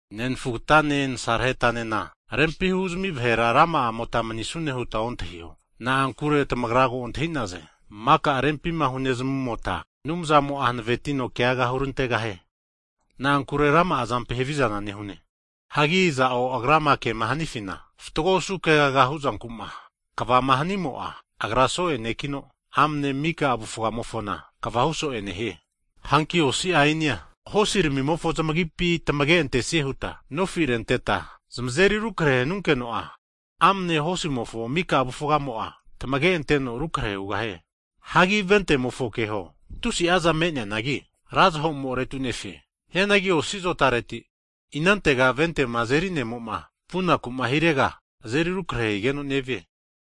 Nenafugtane nasarahetanena rempi huzami vahera rama'amota manisune hutma ontahiho, na'ankure tamagra ko antahi'naze, maka rempima hunezamumota Anumzamo'a hanavetino keaga hurantegahie. Na'ankure rama'a zampi havizana nehune. Hagi iza'o agrama kema hanifima fatgo osu kegaga huzanku'ma kva'ma hanimo'a, agra soe ne'kino amne mika avufgamofona kvahu so'e nehie. Hanki osi ainia hosirimimofo zamagipi tamage'antesie huta nofi renteta, zamazeri rukre hanunkeno'a, amne hosimofo mika avufgamo'a tamage'anteno rukre hugahie. Hagi vente'mofone keho, tusi'aza me'neanagi ra zahomo retunefe. Hianagi osi zotareti, inantego ventema azeri ne'moma vunakuma hirega, azeri rukre higeno nevie.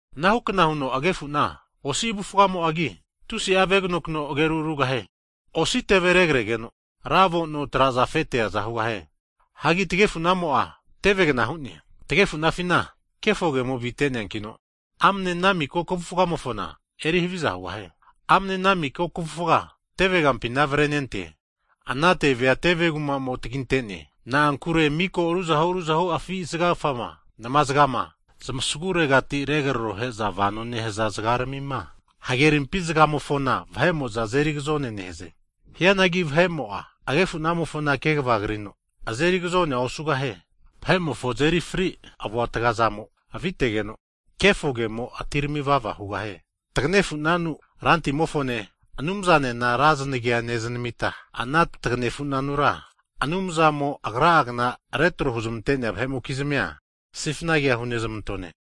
Anahukna huno agefuna osi avufgamo'agi, tusi'a veganokno ageru rugahie. Osi teve regregeno, ra avo'no traza afe teaza hugahie! Hagi tagefunamo'a tevegna hu'ne. Tagefunafina kefo kemo avite'neankino, amne ana miko kavufamofona eri haviza hugahie. Amne ana miko kavufga teve kampina avrenente. Ana tevea teve kuma'mo taginte'ne. Na'ankure mika ruzahu ruzahu afi' zagakfama, namazgama, zmasaguregati regrarohe'za vano nehaza zgaramima, hagerimpi zgamofona vahe'mo'za azeri agazone neheze. Hianagi vahe'mo'a, agefunamofo kegva krino, azeri agazonea osugahie. Vahe'mofo azeri fri avuatgazamo avitegeno, kefo kemoke atirami vava hugahie. Tagnefunanu Rantimofone, Anumzanena ra znagia nezanamita, ana tagnefunanura Anumzamo agra'gna retro huzmente'nea vahe'mokizmi sifna kea hunezmantone.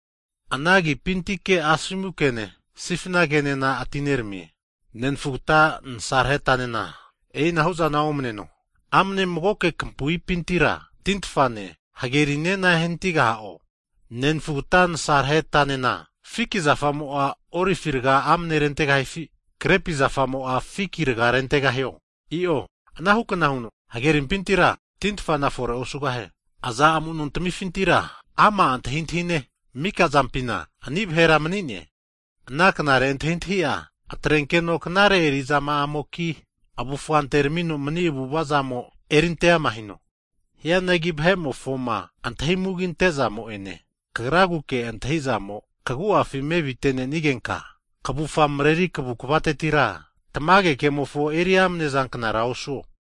Ana agipintike asomu kene, sifna kenena atineramie. Nenfugta nasarehetanena e'inahu'zana omneno. Amne magoke kampuipintira, tintfane, hagerinena ehanatigaha'o? Nenfugata nasarahetanena, fiki zafamo'a olivi rga amne rentegahifi, krepi zafamo'a, fiki raga rentegahio? I'o. Anahu kna huno hagerimpintira tintfana fore osugahie. Aza amu'nontamifintira ama antahintahine mika zampima anihu vahera mani'ne? Ana knare antahintahi'a atrenkeno knare erizama'amoki, avufa anteramino mni avu'ava zamo, erinte ama hino. Hianagi vahe'mofoma antahimugi ante'zamo'ene kagraguke antahizamo kagu'afi mevitenenigenka, kavufga mreri kavukvatetira tamage kemofo eri amnezanknara osuo.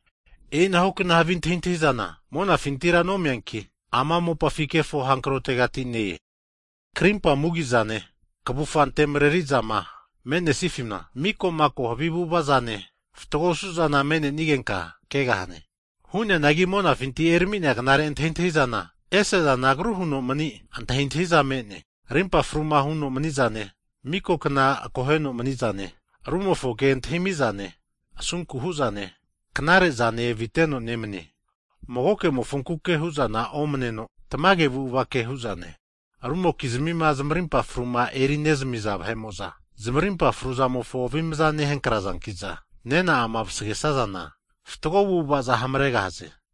E'inahukna havi antahintahizana, monafintira nomeanki, ama mopafi kefo hankrotegati ne-e. Krimpa mugi'zane, kavufa antemareri'zama me'nesifina, miko'mako havi avu'ava'zane fatgo osu'zana me'nenigenka kegahane. Hu'neanagi monafinti erami'nea knare antahintahizana, ese'zana agru huno mani antahintahiza me'ne. Rimpa fruma huno mani'zane, miko kna akoheno mani'zane, rumofo ke antahimi'zane, asunku hu'zane knare'zane aviteno nemanie. Mago'mofonkuke hu'zana omaneno tamage avu'avake hu'zane. Rumokizmima zamarimpa fruma erinezamiza vahe'mo'za, zamarimpa fruzamofo avimaza nehankrazanki'za, nena'ama vasagesazana fatgo avu'avaza hamaregahaze.